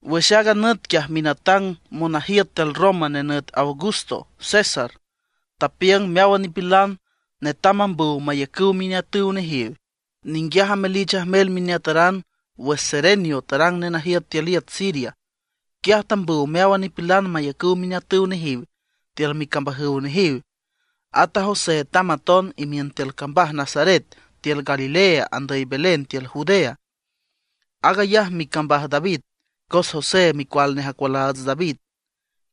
Wüx aaga nüt quiaj minatang monajiüt tiül Roma nenüt Augusto César tapiüng meáwan nipilan netam mambüw mayacüw mineatüw nejiw. Ninguiaj amelich ajmel mineataran wüx Cerenio tarang nenajiüt tiül iüt Siria. Quiaj tambüw meáwan nipilan mayacüw mineatüw nejiw tiül micambajüw nejiw. At a José tamb aton imiün tiül cambaj Nazaret tiül Galilea andüy Belén tiül Judea. Aag ayaj micambaj David, cos José micual nej acualaats David.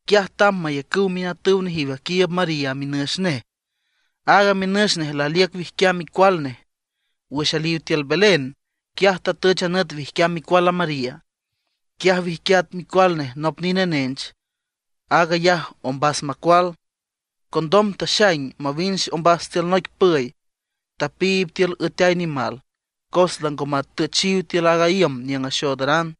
Quiaj tamb mayacüw mineatüw nejiw aquiiüb María minüx nej. Aaga minüx nej laliüc wijquiam micual nej. Wüx aliw tiül Belén, quiaj tatüch a nüt wijquiam micual a María. Quiaj wijquiat micual nej, nop nine nench; aag ayaj ombas macual. Condom taxaing mawinch ombas tiül noic püy, tapiib tiül üeteay nimal, cos lango matüchiw tiül a iüm niüng axoodaran.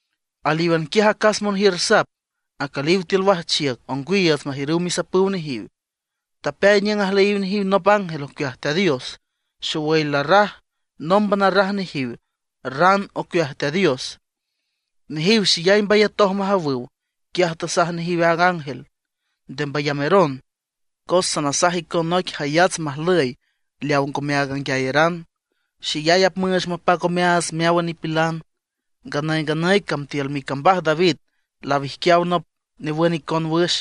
Alíwan quiaj acas monjiür sap, acüliw tiül wajchiüc ongwiiüts majiürüw misapüw nejiw. Tapeay niüng ajlüyiw nejiw nop ángel ocueaj Teat Dios. Xowüy larraj, nómban arraj nejiw ran ocueaj Teat Dios. Nejiw xeyay mbayatoj majawüw. Quiaj tasaj nejiw a ángel: ―Nde mbayameron, cos sanasaj icon noic jayats majlüy leaw ngome aag anguiayeran. Xeyay apmüüch mapac omeaats meáwan nipilan. Nganüy nganüy cam tiül micambaj David lawijquiaw nop newün icon wüx.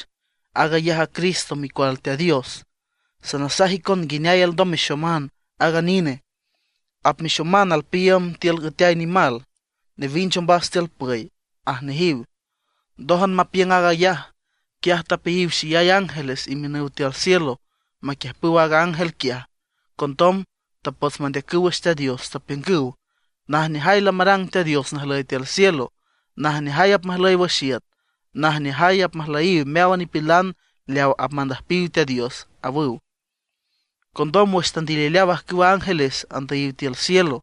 Aag ayaj a CRISTO Micual Teat Dios. Sanasaj icon nguineay alndom mexoman aaga nine. Apmexoman alpiiüm tiül üeteay nimal, newinch ombas tiül püy ―aj nejiw. Ndójan mapiüng aag ayaj, quiaj tapeayiw xeyay ángeles imiün tiül cielo maquiüjpüw aaga ángel quiaj. Condom tapots mandeacüw wüx Teat Dios, tapiüngüw: ¡Najneajay lamarang Teat Dios najlüy tiül cielo, najneajay apmajlüy wüx iüt, najneajay apmajlüyiw meáwan nipilan leaw apmandüjpiw Teat Dios!, awüw. Condom wüx tandilileaw ajcüwa ángeles andüyiw tiül cielo,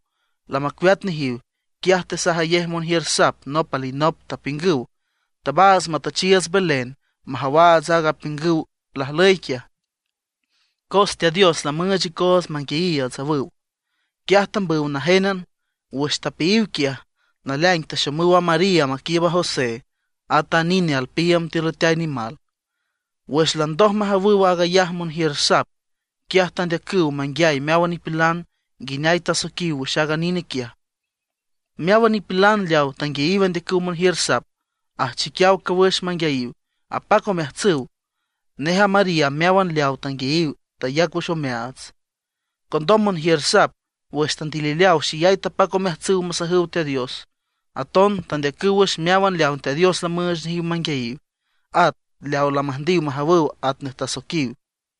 lamacueat nejiw, quiaj tesajayej monjiür sap nop alinop, tapiüngüw: ―Tabaats matüchiiüts Belén majawaats aaga apiüngüw lajlüy quiaj, cos Teat Dios lamüüch icoots manguiayiiüts ―awüw. Quiaj tambüw najénan. Wüx tapeayiw quiaj, naleaing taxomüw a María maquiiüb a José, átan a nine alpiiüm tiül üeteay nimal. Wüx landoj majawüw aag ayaj monjiür sap, quiaj tandeacüw manguiay meáwan nipilan nguineay tasoiquiw wüx aaga nine quiaj. Meáwan nipilan leawa tanguiayiw andeacüw monjiür sap ajchiquiaw cawüx manguiayiw, apac omeajtsüw. Nej a María meáwan leawa tanguiay tayac wüx omeaats. Condom monjiür sap wüx tandilileaw xeyay tapac omeajtsüw masajüw Teat Dios. Aton tandeacüw wüx meáwan leawa Teat Dios lamüüch nejiw manguiayiw, at leaw lamüjndiw majawüw atnej tasoiquiw.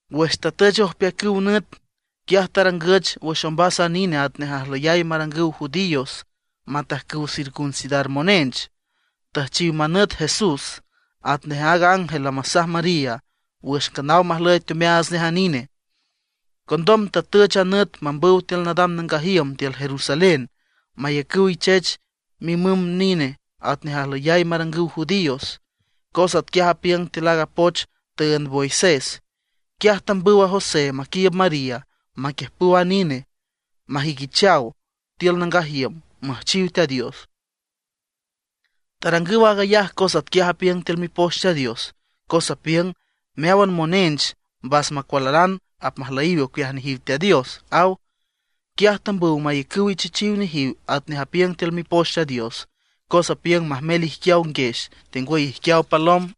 Wüx tatüch ojpeacüw nüt, quiaj tarangüch wüx ombas a nine atnej ajlüyay marangüw judíos matajcüw circuncidar monench; tüjchiw manüt JESS, atnej aaga ángel lamasaj María wüx nganaw majlüy teomeaats nej a nine. Condom tatüch a nüt mambüw tiül nadam nangaj iüm tiül Jerusalén mayacüw ichech mimüm nine atnej ajlüyay marangüw judíos, cos atquiaj apiüng tiül aaga poch tüünd Moisés. Quiaj tambüw José maquiiüb María maquiüjpüw a nine, majüiquichaw tiül nangaj iüm, müjchiw Teat Dios. Tarangüw aag ayaj cos atquiaj apiüng tiül Mipoch Teat Dios, cos apiüng: “Meáwan monench mbas macualaran apmajlüyiw ocueaj nejiw Teat Dios”, aw. Quiaj tambüw mayacüw ichechiw nejiw atnej apiüng tiül Mipoch Teat Dios, cos apiüng majmel ijquiaw nguex tengwüy ijquiaw palom.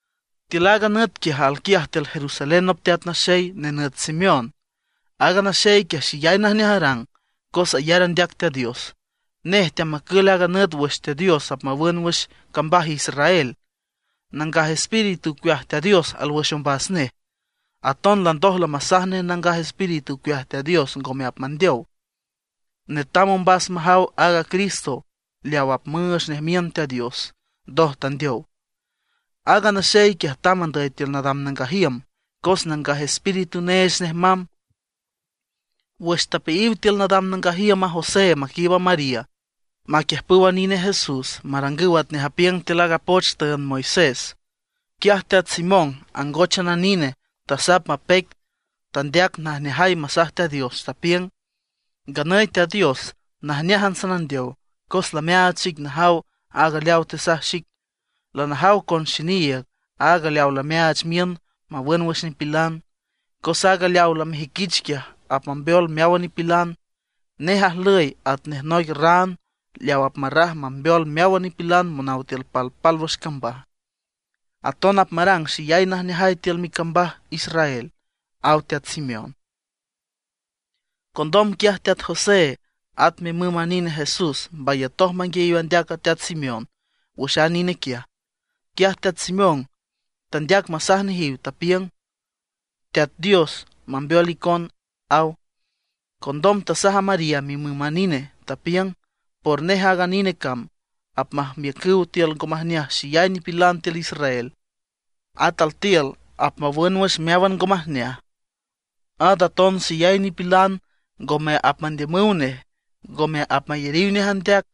Tiül aaga nüt quiaj alquiaj tiül Jerusalén nop teat naxey nenüt Simeón. Aaga naxey quiaj xeyay najneaj arang, cos ayar andeac Teat Dios; nej teamacül aaga nüt wüx Teat Dios apmawün wüx cambaj Israel. Nangaj Espíritu ocueaj Teat Dios alwüx ombas nej. Aton landoj lamasaj nej Nangaj Espíritu ocueaj Teat Dios ngome apmandeow, netam ombas majaw aaga Cristo leaw apmüüch nej miün Teat Dios, ndoj tandeow. Aaga naxey quiaj tamb andüy tiül nadam nangaj iüm cos Nangaj Espíritu neech nej mamb. Wüx tapeayiw tiül nadam nangaj iüm a José maquiiüb María maquiüjpüw a nine Jesús marangüw atnej apiüng tiül aaga poch tüünd Moisés. Quiaj Teat Simeón angóchan a nine, tasap mapeic. Tandeac najneajay masaj Teat Dios, tapiüng: Nganüy Teat Dios, najneájan sanandeow cos lameaach xic najaw aaga leaw tesaj xic. Lanajaw con xiniiüg aag leaw lameaach miün mawün wüx nipilan; cos aaga leaw lamejüiquich quiaj, apmambeol meáwan nipilan. Nej ajlüy atnej noic ran leaw apmarraj mambeol meáwan nipilan monaw tiül palpálwüx cambaj; aton apmarang xeyay najneajay tiül micambaj Israel, aw teat Simeón. Condom quiaj teat José at mimüm a nine Jesús mbayatoj manguiayiw andeac a teat Simeón wüx a nine quiaj. Quiaj teat Simeón tandeac masaj nejiw, tapiüng: ―Teat Dios mambeol icon ―aw. Condom tasaj a María mimüm a nine, tapiüng: ―Por nej aaga nine cam apmajmiücüw tiül ngo majneaj xeyay nipilan tiül Israel. At altiül apmawün wüx meáwan ngo majneaj. At aton xeyay nipilan ngome apmandiümüw nej, ngome apmayariw nej andeac.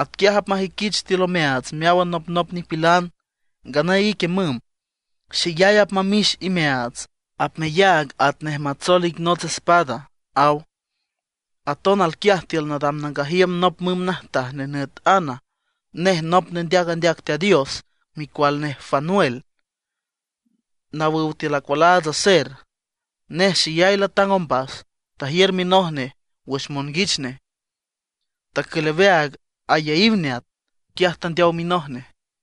Atquiaj apmajüiquich altiül omeaats meáwan anopnop nipilan. Nganüy ique müm, xeyay apmamix imeaats; apmeyaag atnej matsoel ic nots espada ―aw. Aton alquiaj tiül nadam nangaj iüm nop müm najtaj nenüt Ana. Nej nop nendeac andeac Teat Dios, micual nej Fanuel, nawüw tiül acualaats Aser. Nej xeyay latang ombas. Tajiür minoj nej wüx monguich nej, tacül aweaag ayaíw neat, quiaj tandeow minoj nej.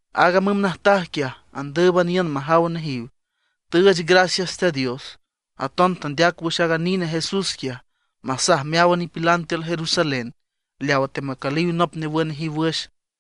Aaga müm natajtaj quiaj andǘüban iün majaw nejiw, tüüch gracias Teat Dios. Aton tandeac wüx aag nine Jesús quiaj, masaj meáwan nipilan tiül Jerusalén leawa teamacüliw nop newün nejiw wüx.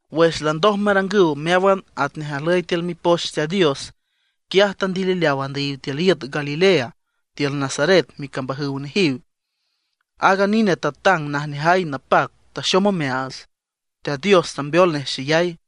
Wüx landoj marangüw meáwan atnej ajlüy tiül mipoch Teat Dios, quiaj tandilileaw andüyiw tiül iüt Galilea, tiül Nazaret micambajüw nejiw. Aaga nine tatang najneajay napac, taxom omeaats, Teat Dios tambeol nej xeyay.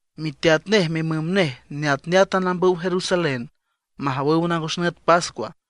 Miteat nej mimüm nej neatneátan ambüw Jerusalén majawüw nangos nüt pascua.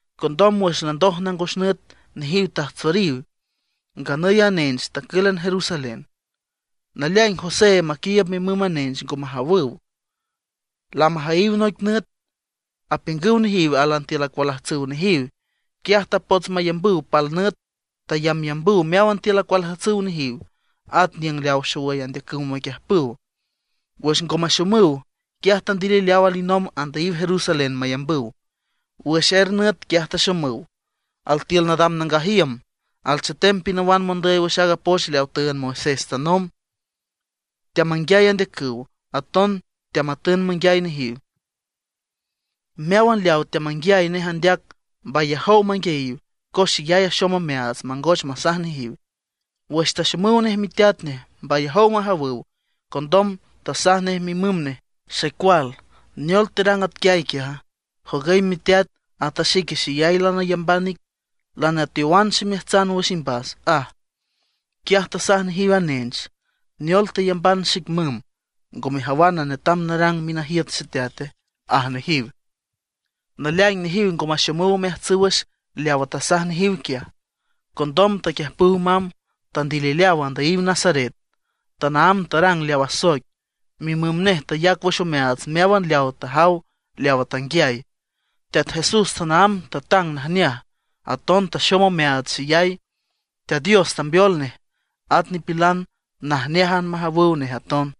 Condom wüx landoj nangos nüt nejiw tajtsoriw; nganüy a nench tacǘlan Jerusalén. Naleaing José maquiiüb mimüm a nench ngo majawüw. Lamajüyiw noic nüt, apiüngüw nejiw álan tiül acualajtsüw nejiw. Quiaj tapots mayambüw pal nüt. Tayambyambüw meáwan tiül acualajtsüw nejiw, at niüng leaw xowüy andeacüw maquiüjpüw. Wüx ngo maxomüw, quiaj tandilileaw alinomb andüyiw Jerusalén mayambüw. Wüx er nüt quiaj taxomüw; altiül nadam nangaj iüm, alchetem pinawan mondüy wüx poch leawa tüünd Moisés tanomb. Teamanguiay andeacüw, aton teamatün manguiay nejiw. Meáwan leawa teamanguiay nej andeac mbayajow manguiayiw, cos xeyay axom omeaats mangoch masaj nejiw. Wüx taxomüw nej miteat nej mbayajow majawüw. Condom tasaj nej mimüm nej: ―Xecual, ¿neol terang atquiay quiaja? Jogüy miteat ata xique xeyay lanayamban ic, lanateowan ximeajtsan wüx imbas ―aj. Quiaj tasaj nejiw a nench: ―¿Neol teyamban xic, müm, ngo mejawana netam narang minajiüt Xeteate? ―aj nejiw. Naleaing nejiw ngo maxomüw omeajtsüw wüx leawa tasaj nejiw quiaj. Condom taquiüjpüw mamb, tandilileaw andüyiw Nazaret. Tanaámb tarang leaw asoic. Mimüm nej tayac wüx omeaats meáwan leawa tajaw leawa tanguiay. Teat Jesús tanaámb tatang najneaj, aton taxom omeaats xeyay. Teat Dios tambeol nej, at nipilan najneájan majawüw nej aton.